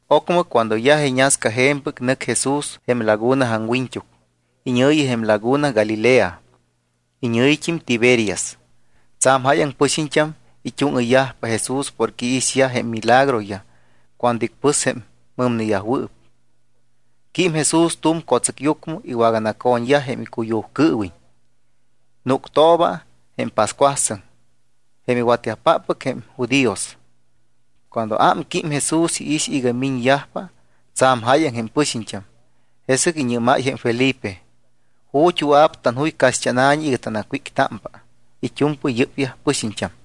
Ocmɨ, cuando yaj iñasca je̱mpɨc, nɨc Jesús jém laguna aŋwiñt́uc, iñɨ̱yi jém laguna Galilea, iñɨ̱yit́im Tiberias. Tsa̱m jáyaŋ pɨxiñt́am it́úŋɨyyajpa Jesús porque iixyaj jém milagroyaj cuando icpɨs jém mɨmneyajwɨɨp. Quím Jesús tu̱m co̱tsɨcyucmɨ, iwaganaco̱ñyaj jém icuyujcɨɨwiñ. Núctooba jém pascuasɨŋ jém iwatyajpáppɨc jém judíos. Cuando ámquím Jesús, iix iga miñyajpa tsa̱m jáyaŋ jém pɨxiñt́am. Jesɨc iñɨ́máy jém Felipe: —¿Ju̱t́ wɨa̱p tanjuy caxt́ána̱ñi iga tanacwíctámpa it́u̱mpɨy yɨ́pyaj pɨxiñt́am?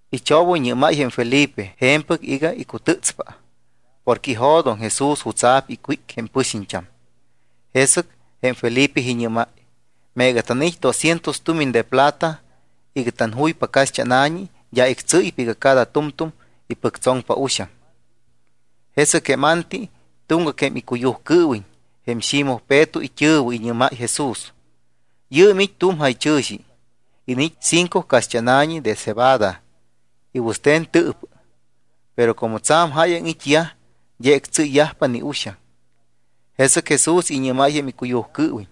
Ichobɨyñɨ́máy jém Felipe je̱mpɨc iga icutɨ́tspa, porque ijo̱doŋ Jesús jutsa̱p icwíc jém pɨxiñt́am. Jesɨc jém Felipe iñɨ́máy: —Meega tanait́ doscientos tumiñ de plata iga tanjuypa caxt́ána̱ñi, d́a ictsɨ́ypa iga cada tu̱mtu̱m ipɨctsoŋpa uxaŋ. Jesɨc jém Anti, tuŋgac jém icuyujcɨɨwiñ, jém Ximoj Peto it́ɨ̱wɨ, iñɨ́máy Jesús: —Yɨɨm it́ tu̱m jaychɨ̱xi. Iniit́ cinco caxt́ána̱ñi de cebada y wɨste̱n tɨɨpɨ. Pero como tsa̱m jáyaŋ it́yaj, d́a ictsɨ́ypa ni uxaŋ. Jesɨc Jesús iñɨ́máy jém icuyujcɨɨwiñ: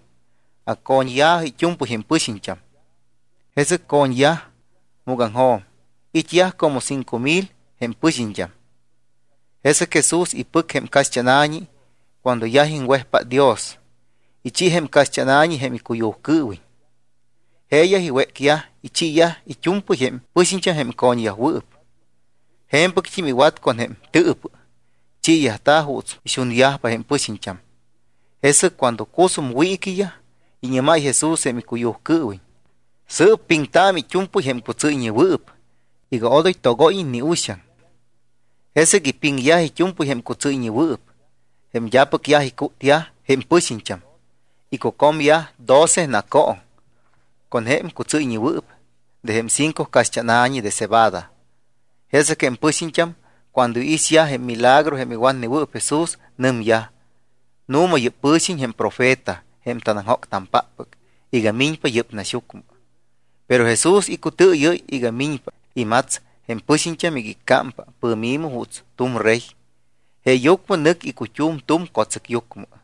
—Acco̱ñya̱jɨ it́u̱mpɨy jém pɨxiñt́am. Jesɨc co̱ñyaj múgaŋjo̱m, it́yaj como cinco mil jém pɨxiñt́am. Jesɨc Jesús ipɨc jém caxt́ána̱ñi. Cuando yaj iŋwejpát Dios, ichi jém caxt́ána̱ñi jém icuyujcɨɨwiñ. Jeeyaj iwécyaj, ichiiyaj it́u̱mpɨy jém pɨxiñt́am jém co̱ñyajwɨɨp. Je̱mpɨct́im iwat con jém tɨɨpɨ. Chiiyajta̱ juuts ixunyajpa jém pɨxiñt́am. Jesɨc cuando cusum wiiquiyaj, iñɨ́máy Jesús jém icuyujcɨɨwiñ: —Sɨɨp piŋtaamɨ it́u̱mpɨy jém cutsɨ́yñewɨɨp iga odoy togóyiñ ni uxaŋ. Jesɨc ipiŋyaj it́u̱mpɨy jém cutsɨ́yñewɨɨp, jém d́apɨc yaj icútyaj jém pɨxiñt́am. Icucomyaj doce nacooŋ con jém cutsɨ́yñewɨɨp de jém cinco caxt́ána̱ñi de cebada. Jesɨc jém pɨxiñt́am cuando iixyaj jém milagro jém iwatnewɨɨp Jesús, nɨmyaj: —Nu̱ma yɨ́p pɨ̱xiñ jém Profeta jém tanaŋjóctampáppɨc iga miñpa yɨ́p naxyucmɨ. Pero Jesús icutɨɨyɨ́y iga miñpa imats jém pɨxiñt́am iga iccámpa pɨ̱mi̱mɨ juuts tu̱m rey, jeeyucmɨ nɨc icut́um tu̱m co̱tsɨcyucmɨ.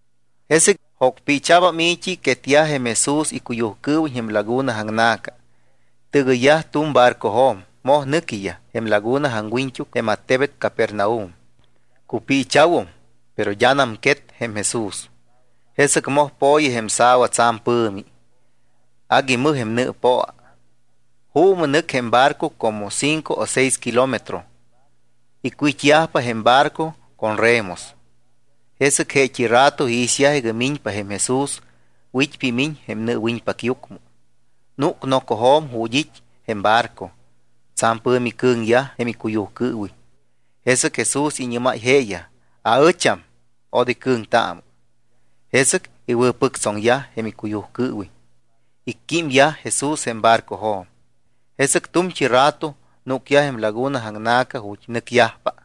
Jesɨc jocpiicha̱bam i̱t́i. Quetyaj jém Jesús icuyujcɨɨwiñ jém laguna aŋna̱ca. Tɨgɨyyaj tu̱m barcojo̱m, moj nɨquiyaj jém laguna aŋwiñt́uc jém attebet Capernaum. Cupiicha̱wum, pero d́anam quet jém Jesús. Jesɨc moj po̱yi jém sa̱wa tsa̱m pɨ̱mi. Agui mɨj jém nɨɨpoa. Juumɨ nɨc jém barco como cinco o seis kilómetro. Icwit́yajpa jém barco con remos. Jesɨc jeet́i rato iixyaj iga miñpa jém Jesús, wit́pa imiñ jém nɨɨwiñpacyucmɨ. Núc nocojo̱m ju̱t́ it́ jém barco. Tsa̱m pɨ̱mi cɨ̱ŋyaj jém icuyujcɨɨwiñ. Jesɨc Jesús iñɨ́máy jeeyaj: —Aɨcham, odoy cɨ̱ŋtaamɨ. Jesɨc iwɨ̱pɨctsoŋyaj jém icuyujcɨɨwiñ, icquímyaj Jesús jém barcojo̱m. Jesɨc tu̱mt́i rato núcyaj jém laguna aŋna̱ca ju̱t́ nɨcyajpa.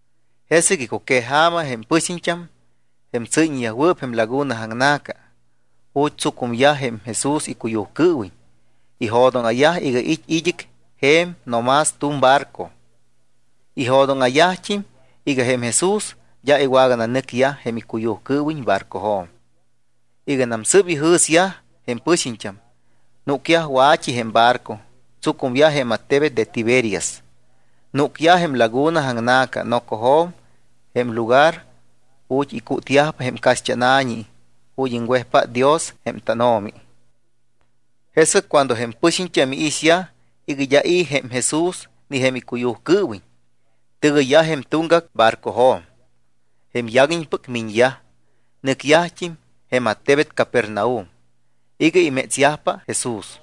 Jesɨc icuqueja̱ma jém pɨxiñt́am, jém tsɨ́yñeyajwɨɨp jém laguna aŋna̱ca, ju̱t́ tsucumyaj jém Jesús icuyujcɨɨwiñ, ijo̱dóŋa̱yaj iga it́ id́ɨc je̱m no más tu̱m barco. Ijo̱dóŋa̱yajt́im iga jém Jesús d́a iwagananɨcyaj jém icuyujcɨɨwiñ barcojo̱m. Iganam sɨɨp ijɨ̱syaj jém pɨxiñt́am, núcyaj wa̱t́i jém barco, tsucumyaj jém attebet de Tiberias. Núcyaj jém laguna aŋna̱ca nocojo̱m jém lugar ju̱t́ icútyajpa jém caxt́ána̱ñi ju̱t́ iŋwejpát Dios jém tánO̱mi. Jesɨc cuando jém pɨxiñt́am iixyaj iga d́a i̱ jém Jesús ni jém icuyujcɨɨwiñ, tɨgɨyyaj jém tuŋgac barcojo̱m, jém yaguiñpɨc miñyaj, nɨcyajt́im jém attebet Capernaum iga imétsyajpa Jesús.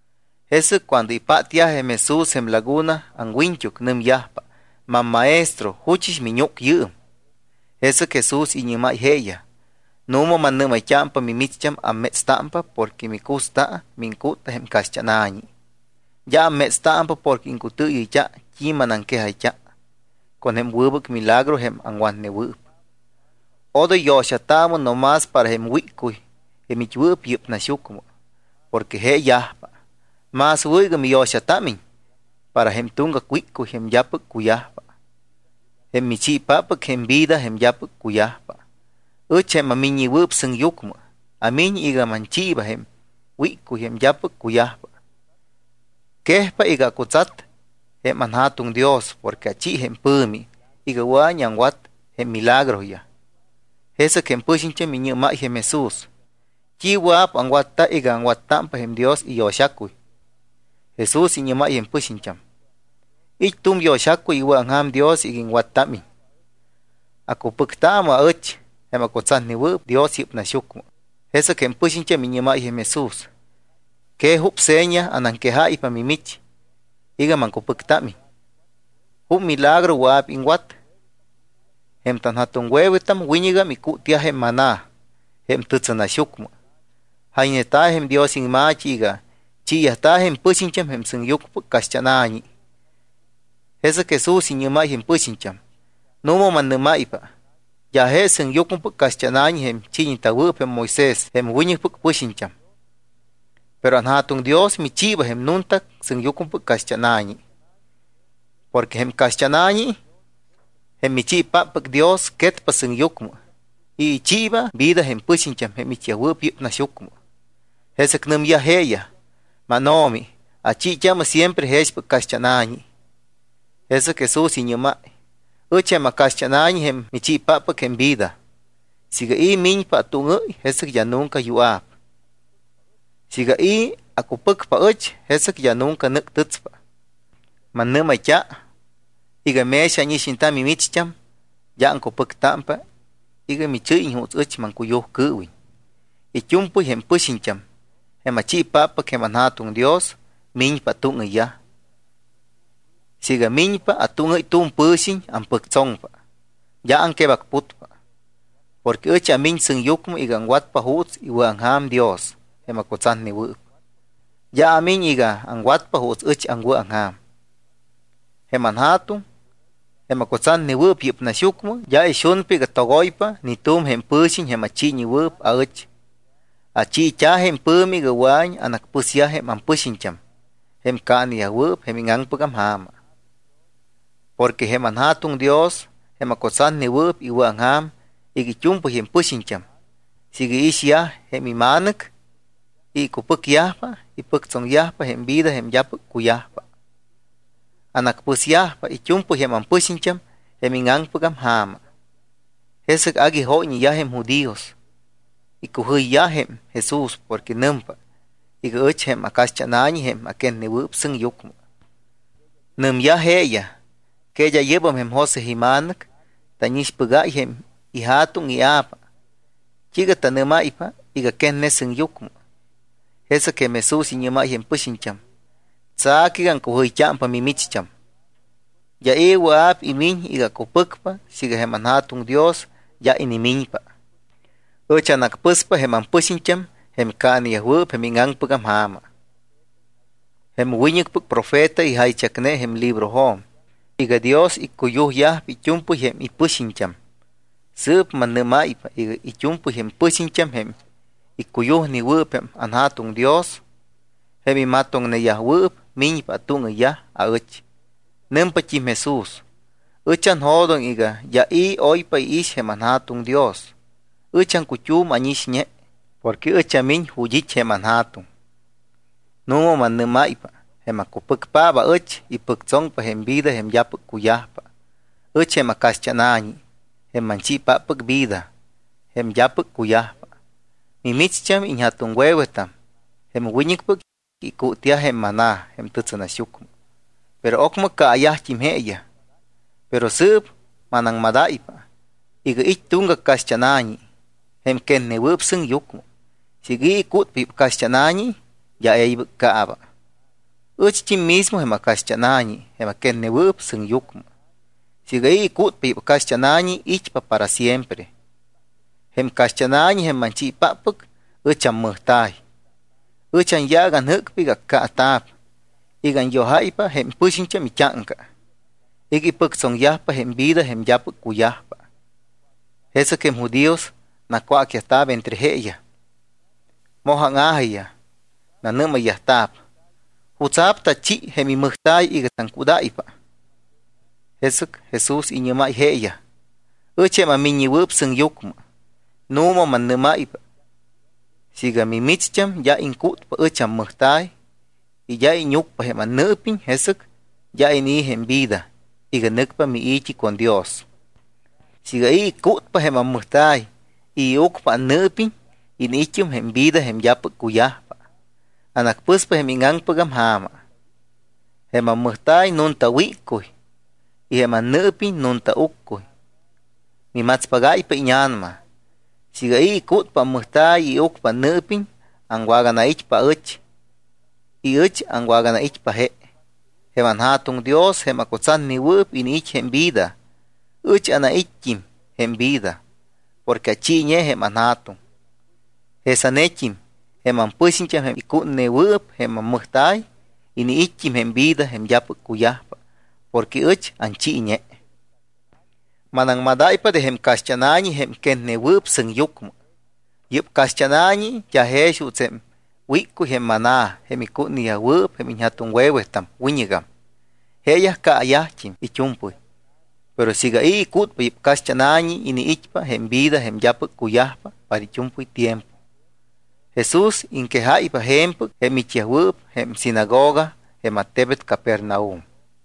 Jesɨc cuando ipátyaj jém Jesús jém laguna aŋwiñt́uc nɨmyajpa: —MamMaestro, ¿juchɨs miñúc yɨɨm? Jesɨc Jesús iñɨ́máy jeeyaj: —Nu̱ma mannɨ́máypa, mimicht́am ammétstámpa porque micusta mu iŋcútta jém caxt́ána̱ñi. D́a ammétstámpa porque iŋcutɨɨyɨyt́a t́i manaŋquejayt́a con jém wɨbɨc milagro jém aŋwatnewɨɨp. Odoy yo̱xataamɨ no más para jém wíccuy, jém it́wɨɨp yɨ́p naxyucmɨ, porque je yajpa. Más wɨ̱ iga miyo̱xatámiñ para jém tuŋgac wíccuy jém d́apɨc cuyajpa, jém michiipáppɨc jém vida jém d́apɨc cuyajpa. Ɨch, jém aMiññewɨɨp Sɨŋyucmɨ, amiñ iga manchiiba jém wíccuy jém d́apɨc cuyajpa. Quejpa iga acutsat jém anJa̱tuŋ Dios porque achi jém pɨ̱mi iga wɨa̱iñ aŋwat jém milagroyaj. Jesɨc jém pɨxiñt́am iñɨ́máy jém Jesús: —¿T́i wɨa̱p aŋwatta iga aŋwattámpa jém Dios iyo̱xacuy? Jesús iñɨ́máy jém pɨxiñt́am: —It́ tu̱m yo̱xacuy iwɨ̱aŋja̱m Dios iga iŋwattámiñ, acupɨctaamɨ aɨch jém acutsatnewɨɨp Dios yɨ́p naxyucmɨ. Jesɨc jém pɨxiñt́am iñɨ́máy jém Jesús: —¿Que jup seña anaŋquejáypa mimich iga maŋcupɨctámiñ? ¿Jup milagro wɨa̱p iŋwat? Jém tanja̱tuŋwe̱wetam wiñɨgam icútyaj jém maná jém tɨtsɨnaxyucmɨ. Jayñeta̱ jém Dios iŋma̱t́i iga: “Chiiyajta̱ jém pɨxiñt́am jém sɨŋyucmɨpɨc caxt́ána̱ñi.” Jesɨc Jesús iñɨ́máy jém pɨxiñt́am: —Nu̱ma mannɨ́máypa, d́a je sɨŋyucmɨpɨc caxt́ána̱ñi jém ichiiñewɨɨp jém Moisés jém wiñɨcpɨc pɨxiñt́am. Pero anJa̱tuŋ Dios michiiba jém nunta sɨŋyucmɨpɨc caxt́ána̱ñi. Porque jém caxt́ána̱ñi, jém michiipáppɨc Dios, quetpa sɨŋyucmɨ y ichiiba vida jém pɨxiñt́am jém it́yajwɨɨp yɨ́p naxyucmɨ. Jesɨc nɨmyaj jeeyaj: —MánO̱mi, achiit́aamɨ siempre jexpɨc caxt́ána̱ñi. Jesɨc Jesús iñɨ́máy: —Ɨch jém acaxt́ána̱ñi jém michiipáppɨc jém vida. Siiga i̱ miñpa atúŋɨ́y, jesɨc d́a nunca yua̱p; siiga i̱ acupɨcpa aɨch, jesɨc d́a nunca nɨ́ctɨtspa. Mannɨ́mayt́a iga mex ánixñeta mimicht́am, d́a aŋcupɨctámpa iga michɨ́yiñ juuts ɨch maŋcuyujcɨɨwiñ. It́u̱mpɨy jém pɨxiñt́am, jém achiipáppɨc jém anJa̱tuŋ Dios, miñpa atúŋɨyyaj. Siiga miñpa atúŋɨ́y tu̱m pɨ̱xiñ, ampɨctsoŋpa, d́a aŋquebacputpa. Porque ɨch amiñ sɨŋyucmɨ iga aŋwatpa juuts iwɨ̱aŋja̱m Dios jém acutsatnewɨɨp. D́a amiñ iga aŋwatpa juuts aɨch aŋwɨ̱aŋja̱m. Jém anJa̱tuŋ, jém acutsatnewɨɨp yɨ́p naxyucmɨ, d́a ixunpa iga togoypa ni tu̱m jém pɨ̱xiñ jém achiiñewɨɨp aɨch. Achiit́a̱ jém pɨ̱mi iga wɨa̱iñ anacpɨsyaj jém ampɨxiñt́am jém caaneyajwɨɨp jém íŋaŋpɨgam ja̱ma. Porque jém anJa̱tuŋ Dios, jém acutsatnewɨɨp, iwɨ̱aŋja̱m iga it́u̱mpɨy jém pɨxiñt́am, siiga iixyaj jém iMa̱nɨc, icupɨcyajpa, ipɨctsoŋyajpa jém vida jém d́apɨc cuyajpa. Anacpɨsyajpa it́u̱mpɨy jém ampɨxiñt́am jém íŋaŋpɨgam ja̱ma. Jesɨc agui jóyñeyaj jém judíos. Icujɨyyaj jém Jesús porque nɨmpa iga: “Ɨch jém acaxt́ána̱ñi jém aquetnewɨɨp sɨŋyucmɨ.” Nɨmyaj jeeyaj: —¿Que d́a yɨ́bam jém José ima̱nɨc? Tánixpɨ́gáy jém ija̱tuŋ y ia̱pa. ¿T́iiga tanɨ́máypa iga quetne sɨŋyucmɨ? Jesɨc jém Jesús iñɨ́máy jém pɨxiñt́am: —Tsa̱cɨ iga aŋcujɨyt́ámpa mimicht́am. D́a i̱ wɨa̱p imiñ iga acupɨcpa siiga jém anJa̱tuŋ Dios d́a inimiñpa. Ɨch anacpɨspa jém ampɨxiñt́am jém caaneyajwɨɨp jém íŋaŋpɨgam ja̱ma. Jém wiñɨcpɨc profeta ijaychacne jém librojo̱m iga: “Dios iccuyujyajpa it́u̱mpɨy jém ipɨxiñt́am.” Sɨɨp mannɨ́máypa iga it́u̱mpɨy jém pɨxiñt́am jém iccuyujneyajwɨɨp jém anJa̱tuŋ Dios, jém imatoŋneyajwɨɨp, miñpa atúŋɨyyaj aɨch. Nɨmpat́im Jesús: —Ɨch anjo̱doŋ iga d́a i̱ oypa iix jém anJa̱tuŋ Dios, ɨch aŋcut́um ánixñe. Porque ɨch amiñ ju̱t́ it́ jém anJa̱tuŋ. Nu̱ma mannɨ́máypa, jém acupɨcpaap aɨch, ipɨctsoŋpa jém vida jém d́apɨc cuyajpa. Ɨch jém acaxt́ána̱ñi, jém manchiipáppɨc vida jém d́apɨc cuyajpa. Mimicht́am iñja̱tuŋwe̱wetam, jém wiñɨcpɨc, icútyaj jém maná jém tɨtsɨnaxyucmɨ. Pero ocmɨ caayajt́im jeeyaj. Pero sɨɨp manaŋmadáypa iga it́ tuŋgac caxt́ána̱ñi jém quetnewɨɨp sɨŋyucmɨ. Siiga i̱ icútpa yɨ́p caxt́ána̱ñi d́a e̱ybɨc caaba. Ɨcht́im mismo jém acaxt́ána̱ñi jém aquetnewɨɨp sɨŋyucmɨ. Siiga i̱ icútpa yɨ́p caxt́ána̱ñi, it́pa para siempre. Jém caxt́ána̱ñi, jém manchiipáppɨc, ɨch ammɨjta̱y. Ɨch anyaac anjɨ́cpa iga accaata̱p iga anyojáypa jém pɨxiñt́am it́áŋca iga ipɨctsoŋyajpa jém vida jém d́apɨc cuyajpa. Jesɨc jém judíos nacwácyajta̱p entre jeeyaj. Moj áŋa̱jiyaj. Nanɨ́mayyajta̱p: —¿Jutsa̱p tachi jém imɨjta̱y iga taŋcúdáypa? Jesɨc Jesús iñɨ́máy jeeyaj: —Ɨch jém aMiññewɨɨp Sɨŋyucmɨ, nu̱ma mannɨ́máypa siiga mimicht́am d́a iŋcútpa ɨch ammɨjta̱y y siiga d́a íñucpa jém annɨɨpiñ, jesɨc d́a inii̱ jém vida iga nɨcpa mii̱t́i con Dios. Siiga i̱ icútpa jém ammɨjta̱y y iucpa annɨɨpiñ, iniit́um jém vida jém d́apɨc cuyajpa; anacpɨspa jém íŋaŋpɨgam ja̱ma. Jém ammɨjta̱y nunta wíccuy y jém annɨɨpiñ nunta uccuy, mimatspagáypa íña̱nama. Siiga i̱ icútpa ammɨjta̱y y iucpa annɨɨpiñ, awaganait́pa aɨch y ɨch aŋwaganait́pa je. Jém anJa̱tuŋ Dios jém acutsatnewɨɨp iniit́ jém vida. Ɨch anait́t́im jém vida porque achiiñe jém anJa̱tuŋ. Jesanet́im jém ampɨxiñt́am jém icútnewɨɨp jém ammɨjta̱y, iniit́yajt́im jém vida jém d́apɨc cuyajpa, porque ɨch anchiiñe. Manaŋmadáypa de jém caxt́ána̱ñi jém quetnewɨɨp sɨŋyucmɨ. Yɨ́p caxt́ána̱ñi d́a jex juuts jém wíccuy jém maná jém icútneyajwɨɨp jém iñja̱tuŋwe̱wetam wiñɨgam. Jeeyaj caayajt́im it́u̱mpɨy. Pero siiga i̱ icútpa yɨ́p caxt́ána̱ñi, iniit́pa jém vida jém d́apɨc cuyajpa para it́u̱mpɨy tiempo. Jesús iŋquejáypa je̱mpɨc jém it́yajwɨɨp jém sinagoga jém attebet Capernaum.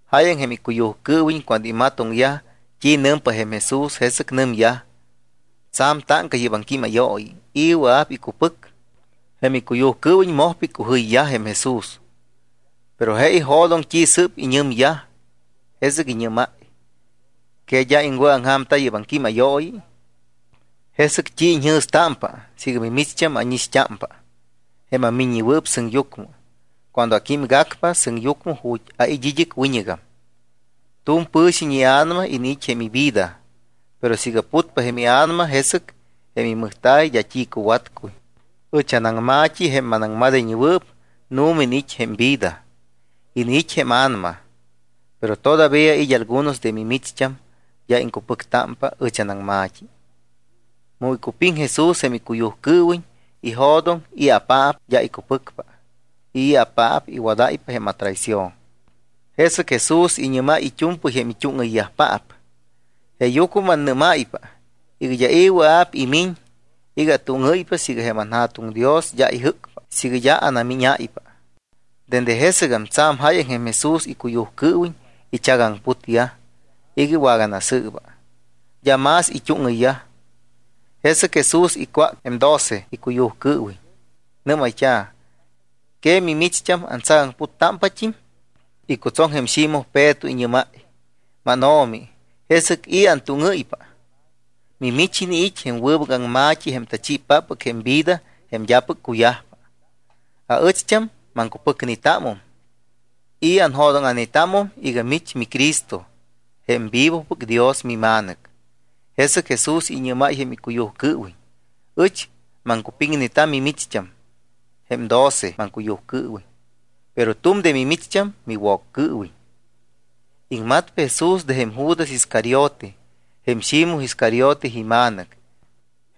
Jáyaŋ jém icuyujcɨɨwiñ cuando imatoŋyajpa t́i nɨmpa jém Jesús, jesɨc nɨmyaj: —Tsa̱m táŋca yɨ́p aŋquímayooyi. ¿I̱ wɨa̱p icupɨc? Jém icuyujcɨɨwiñ mojpa icujɨyyaj jém Jesús. Pero je ijo̱doŋ t́i sɨ́p iñɨmyaj, jesɨc iñɨ́máy: —¿Que d́a iŋwɨ̱aŋja̱mta yɨ́p aŋquímayooyi? ¿Jesɨc t́i iñjɨ̱stámpa siiga mimicht́am ánixt́ámpa, jém aMiññewɨɨp Sɨŋyucmɨ, cuando aquímgacpa sɨŋyucmɨ ju̱t́ ait́ id́ɨc wiñɨgam? Tu̱m pɨ̱xiñ ia̱nama iniit́ jém ivida. Pero siiga putpa jém ia̱nama, jesɨc jém imɨjta̱y d́a t́i cuwatcuy. Ɨch anaŋma̱t́i, jém manaŋmadayñewɨɨp, nu̱ma iniit́ jém vida, iniit́ jém a̱nama. Pero todavía it́ algunos de mimicht́am d́a iŋcupɨctámpa ɨch anaŋma̱t́i. Mu icupiŋ Jesús jém icuyujcɨɨwiñ ijo̱doŋ i̱apaap d́a icupɨcpa y i̱apaap iwadáypa jém atraición. Jesɨc Jesús iñɨ́máy it́u̱mpɨy jém it́úŋɨyyajpaap: —Jeeyucmɨ mannɨ́máypa iga d́a i̱ wɨa̱p imiñ iga atúŋɨ́ypa siiga jém anJa̱tuŋ Dios d́a ijɨ́cpa, siiga d́a anamíñáypa. Dende jesɨgam tsa̱m jáyaŋ jém Jesús icuyujcɨɨwiñ ichagaŋputyaj iga iwaganasɨɨba, d́a más it́úŋɨyyaj. Jesɨc Jesús icwácpa jém doce icuyujcɨɨwiñ. Nɨ́mayt́a̱: —¿Que mimicht́am antsagaŋputpat́im? Icutsoŋ jém Ximoj Peto, iñɨ́máy: —MánO̱mi, ¿jesɨc i̱ antúŋɨ́ypa? Mimich iniit́ jém wɨbɨc aŋma̱t́i jém tachiipáppɨc jém vida jém d́apɨc cuyajpa. Aɨcht́am maŋcupɨcnetámum y anjo̱dóŋa̱netámum iga mich miCristo jém Vivopɨc Dios miMa̱nɨc. Jesɨc Jesús iñɨ́máy jém icuyujcɨɨwiñ: —Ɨch maŋcupiŋneta mimicht́am jém doce maŋcuyujcɨɨwiñ. Pero tu̱m de mimicht́am miwoccɨɨwiñ. Iŋmatpa Jesús de jém Judas Iscariote, jém Ximoj Iscariote ima̱nɨc.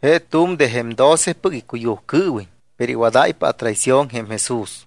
Je tu̱m de jém docepɨc icuyujcɨɨwiñ, pero iwadáypa atraición jém Jesús.